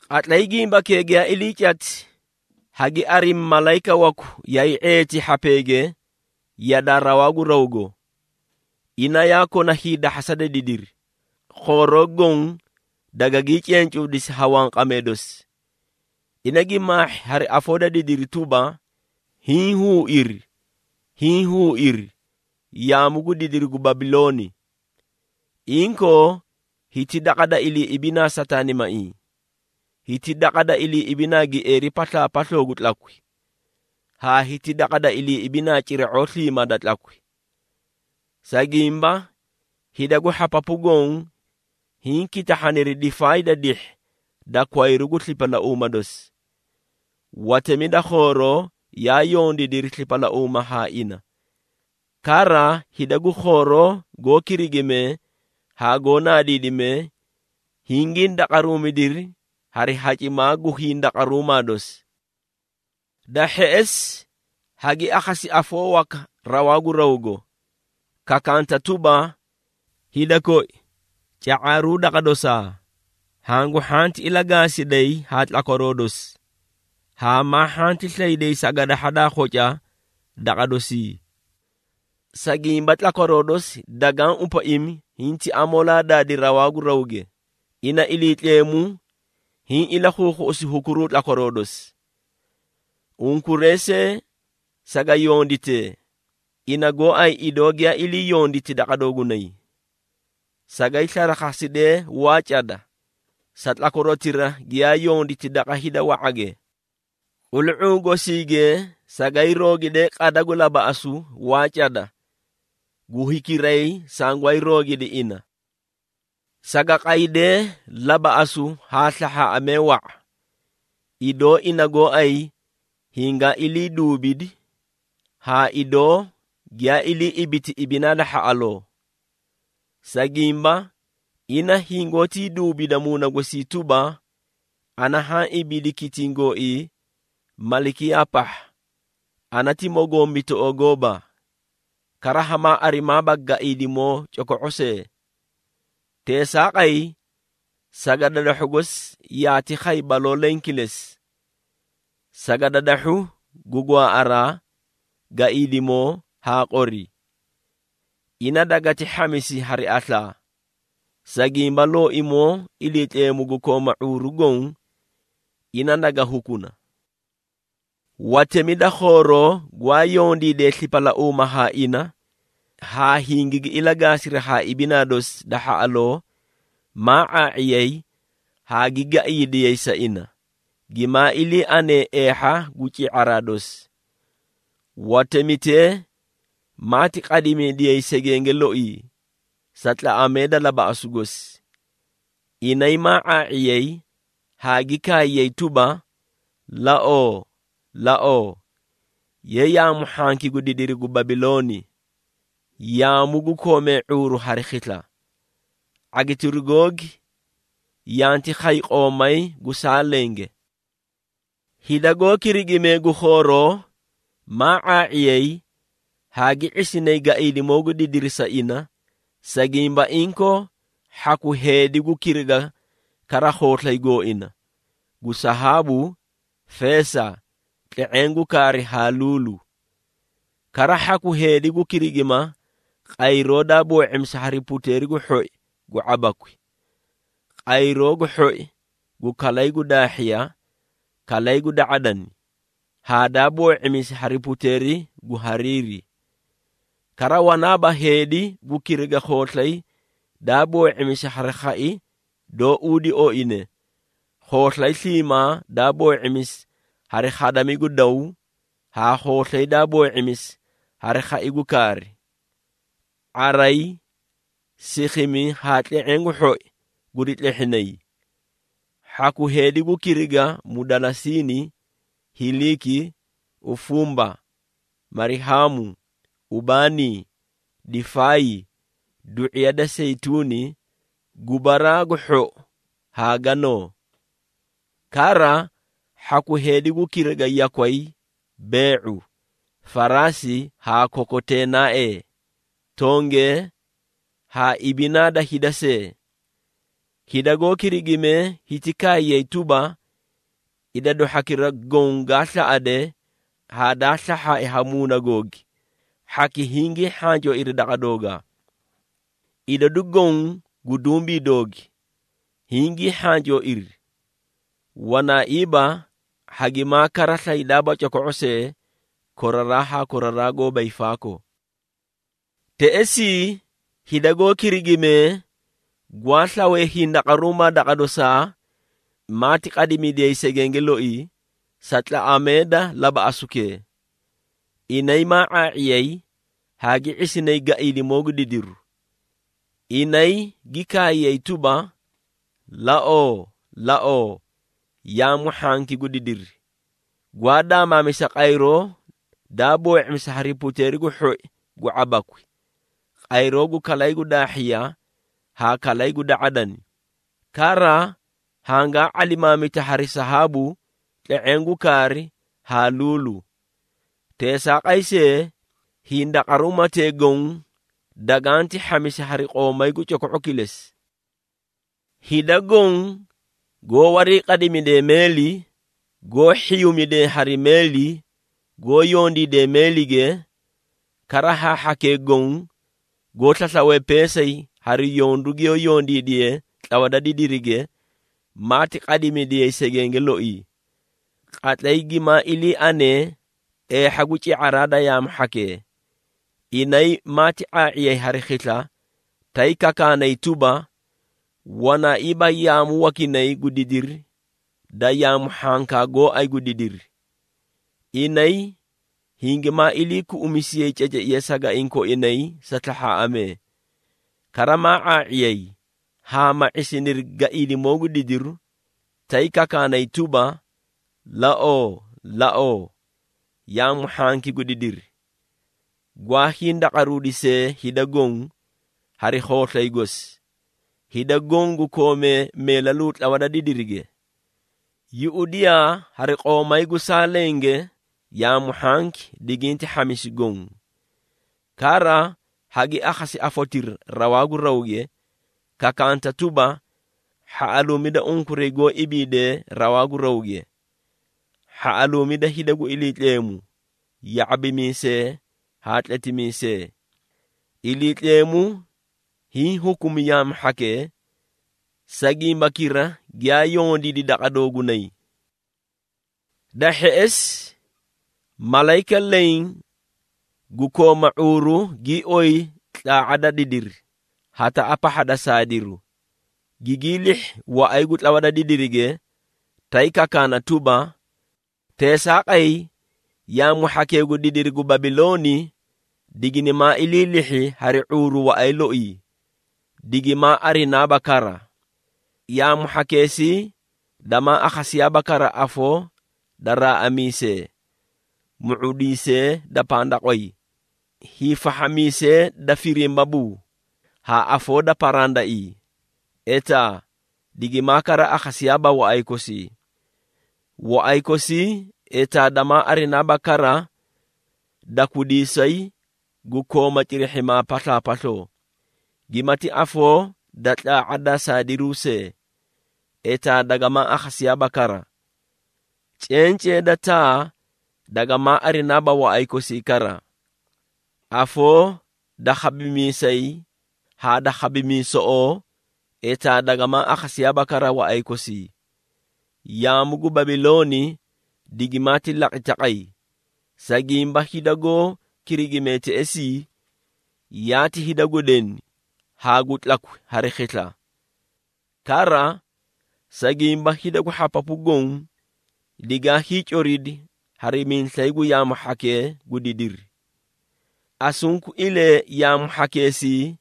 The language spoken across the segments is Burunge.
Qatlay gimbakee giyaa ilii cati, hagi arimi malayika waku yaay ⁄eeti hhapeege yadaa rawaa gu rawgo. Ina yaa kona hiidahhasa da didiri, khooroo goõ dagagii cencuudisi ha wanqamee dosi. Ina gi maahhi hari afoo da didiri tuba: “Hiĩ huuiri! Hiĩ huuiri! Yaamu gu didiri gu Babilooni! Inkoo hiti daqa da iliiꞌibinaa sataanimaiĩ. Hiti daqa da iliiꞌibinaa gieeri paslaapasloo gu tlakwi, haa hiti daqa da iliiꞌibinaa cira⁄oo sliimaa da tlakwi. Sa gimba, hida gu hhapapu goõ hiĩ kitahhaniri difaay da dihhi da kwayru gu slipalauuma dosi. Watemi da khooroo yaa yondiidiri slipalauuma haa ina, kara hida gu khooroo goó kirigimee haa goó naadiidimee, hingii ndaqaruumidiri hari hacimaa gu hindaqaruumaa dosi.” Da hheꞌesi, hagi akhasi afoo waka rawaa gu rawgo, kakanta tuba, “Hida koi, ca⁄aaruu daqa dosaa, hangu hhanti ilagaasiday haa tlakwaroo dosi, haa maa hhanti slayday sagadahha daa khoca daqa dosii. Sa gimba, tlakwaroo dosi dagaã upaimi hinti amoolaa daadi rawaa gu rawge, ina Iliitleemu hiĩ ilakhuukhuꞌusi hukuruu tlakwaroo dosi. Unkuray see saga yonditee, ina gooay idoo giyaa iliiyonditi daqa doogunay. Sagay slarakhasidee waa cada, sa tlakwarotira giyaa yonditi daqa hida wa⁄age. Qulu⁄uu gosiige sagay roogidee qada gu labaꞌasu waa cada gu hikiray sangwaay roogidi ina. Saga qaydee labaꞌasu haa slahhaaꞌamee wa⁄a, idoo ina gooay hingaa iliiduubidi, haa idoo giyaa ilii ibiti ibinaa da hhaꞌaloo. Sa gimba, ina hingoótii duubida muuna gosii tuba, ‘Ana haã ibiidi kitiĩ gooii malikiyaa pahha, ana ti mogombitoꞌoo gooba, kara hamaa arimaaba gaiidimoo coko⁄o see!’ Teesaaqay, sagadadahhu gosi yaati khay baloo leẽ kilesi, sagadadahhu gu gwaaꞌaraa, gaiidimoo haa qori. Ina dagati hhamisi hari aslaa, sa gimba, Looimoo Iliitleemu gu kooma ⁄uuru goõ, ina naga hukuna.” Watemi da khooroo gwaa yondiidee slipalauuma haa ina, haa hingigi ilagaasiri haa ibinaa dosi da hhaꞌaloo, maa ⁄aa⁄iyay haa gi gaiidiyay sa ina, gimaa ilii anee eehha gu ci⁄araa dosi. Watemitee maati qadimidiyay segenge loii, sa tlaꞌamee da labaꞌasu gosi. Inay maa ⁄aa⁄iyay haa gi kaayay tuba, “Laoo! Laoo, ye yaamu hhanki gu didiri gu Babilooni, yaamu gu koomee ⁄uuru hari khisla! ⁄agitiru googi yanti khay qoomay gu saa lenge.” Hida goó kirigimee gu khooroo, maa ⁄aa⁄iyay haa gi ⁄isinay gaiidimoo gu didiri sa ina, sa gimba inkoo hhaku heedi gu kiriga kara khooslay gooina, gu sahaabu, feesa, tle⁄eẽ gu kaari haa luulu. Kara hhaku heedi gu kirigima qayroo daa boo⁄imisi hari puteeri gu hhoi gu ⁄abakwi, qayroo gu hhoi gu kalay gu daahhiya, kalay gu da⁄adani haa daa boo⁄imisi hari puteeri gu hariiri. Kara wanaaba heedi gu kiriga khooslay daa boo⁄imisi hari khai doó uudi oine, khooslay sliimaa daa boo⁄imisi hari khadami gu daw haa khooslay daa boo⁄imisi hari khai gu kaari. ⁄aray, sikhimi haa tle⁄eẽ gu hhoi guri tlehhinay. Hhaku heedi gu kiriga mudalasiini, hiliiki, ufumba, marihaamu, ubaanii, difaay, du⁄iya da seyituuni, gubaraa gu hhou haa ganoo. Kara hhaku heedi gu kiriga yakway, bee⁄u, faraasi haa kokoteenaaee, tongee haa ibinaa da hida see. Hida goó kirigimee hiti kaayay tuba, “Idadu hhakira goõ gaa slaꞌade haa daa slahhaai ha muuna googi, hhaki hingii hhancooiri daqa doogaa. Idadu goõ gu dumbii doogi, hingii hhancooiri. Wanaaiiba, hagimaa kara slaydaaba coko⁄o see, koraraa haa koraraa goóba hiifaakoo!” Teꞌesii hida goó kirigimee gwaa slawee hindaqaruumaa daqa dosaa, maati qadimidiyay segenge loii, sa tlaꞌamee da labaꞌasukee. Inay maa ⁄aa⁄iyay haa gi ⁄isinay gaiidimoo gu didiri. Inay gi kaayay tuba: “Laoo! Laoo, yaamu hhanki gu didiri, gwaa daamaamisa qayroo daa boo⁄imisi hari puteeri gu hhoi gu ⁄abakwi, qayroo gu kalay gu daahhiya haa kalay gu da⁄adani, kara hangaa ⁄alimaamita hari sahaabu, tle⁄eẽ gu kaari haa luulu! Teesaaqay see, hindaqaruumatee goõ daganti hhamisi hari qoomay gu coko⁄u kilesi!” Hida goõ goó wariiqadimidee meeli, goó hhiyuumidee hari meeli, goó yondiidee meelige, kara haa hhakee goõ goó slaslawe peesay hari yondu giyoó yondiidiyee tlawa da didirige, maati qadimidiyay segenge loii. Qatlay gimaa ilii anee eehha gu ci⁄araa da yaamu hhakee, inay maati ⁄aa⁄iyay hari khisla, tay kakaanay tuba, “Wanaaiiba yaamu wakinay gu didiri da yaamu hhankaa gooay gu didiri!” Inay hingimaa iliikuꞌumisiyay ceceiya sagaiĩ koinay sa slahhaaꞌamee. Kara maa ⁄aa⁄iyay haa ma ⁄isiniri gaiidimoo gu didiru, tay kakaanay tuba, “Laoo! Laoo, yaamu hhanki gu didiri, gwaa hindaqaruudisee hida goõ, hari khooslay gosi, hida goõ gu koomee meelaluu tlawa da didirige. Yuꞌudiyaa hari qoomay gu saa lenge yaamu hhanki diginti hhamisi goõ. Kara hagi akhasi afotira rawaa gu rawge, kakaanta tuba, ‘Hhaꞌaluumida unkuray goó ibiidee rawaa gu rawge! Hhaꞌaluumida hida gu Iliitleemu, ya⁄abimiisee haa tletimiisee! Iliitleemu hiĩ hukumi yaamu hhakee, sa gimbakira giyaa yondiidi daqa doogunay.’” Da hheꞌesi, malayika leẽ gu kooma ⁄uuru gii oyi tlaa⁄a da didiri, hataꞌa pahha da saadiru, gigii lihhi waꞌay gu tlawa da didirige, tay kakaana tuba, “Teesaaqay, Yaamu hhakee gu didiri gu Babilooni, diginimaa ilii lihhi hari ⁄uuru waꞌay loii, digimaa arinaaba kara. Yaamu hhakeesii damaa akhasiyaaba kara afoo da raaꞌamiisee, mu⁄udiisee da pandaqway, hiifahhamiisee da firimbabuu, haa afoo da parandaiĩ, etaa digimaa kara akhasiyaaba waꞌay kosii. Waꞌay kosii, etaa damaa arinaaba kara dakwidiisay gu kooma cirihhimaa paslaapasloo. Gimati afoo da tlaa⁄a da saadiruu see, etaa dagamaa akhasiyaaba kara. Cencee da taa dagamaa arinaaba waꞌay kosii kara, Afoo da khabimiisay haa da khabimiisoꞌoo etaa dagamaa akhasiyaaba kara waꞌay kosii. Yaamu gu Babilooni digimaati laqi taqay, sa gimba hida goó kirigimee teꞌesii, yaati hida gu deni haa gu tlakwi hari khisla. Kara, sa gimba hida gu hhapapu goõ, digaa hiicoridi hari miislay gu yaamu hhakee gu didiri!” Asunkuilee yaamu hhakeesii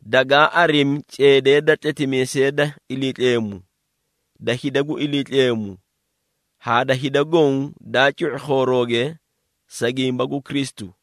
dagaa arimi ceedee da tletimiisee da Iliitleemu, da hida gu Iliitleemu haa da hida goõ daa cu⁄i khoorooge sa gimba gu Kristu.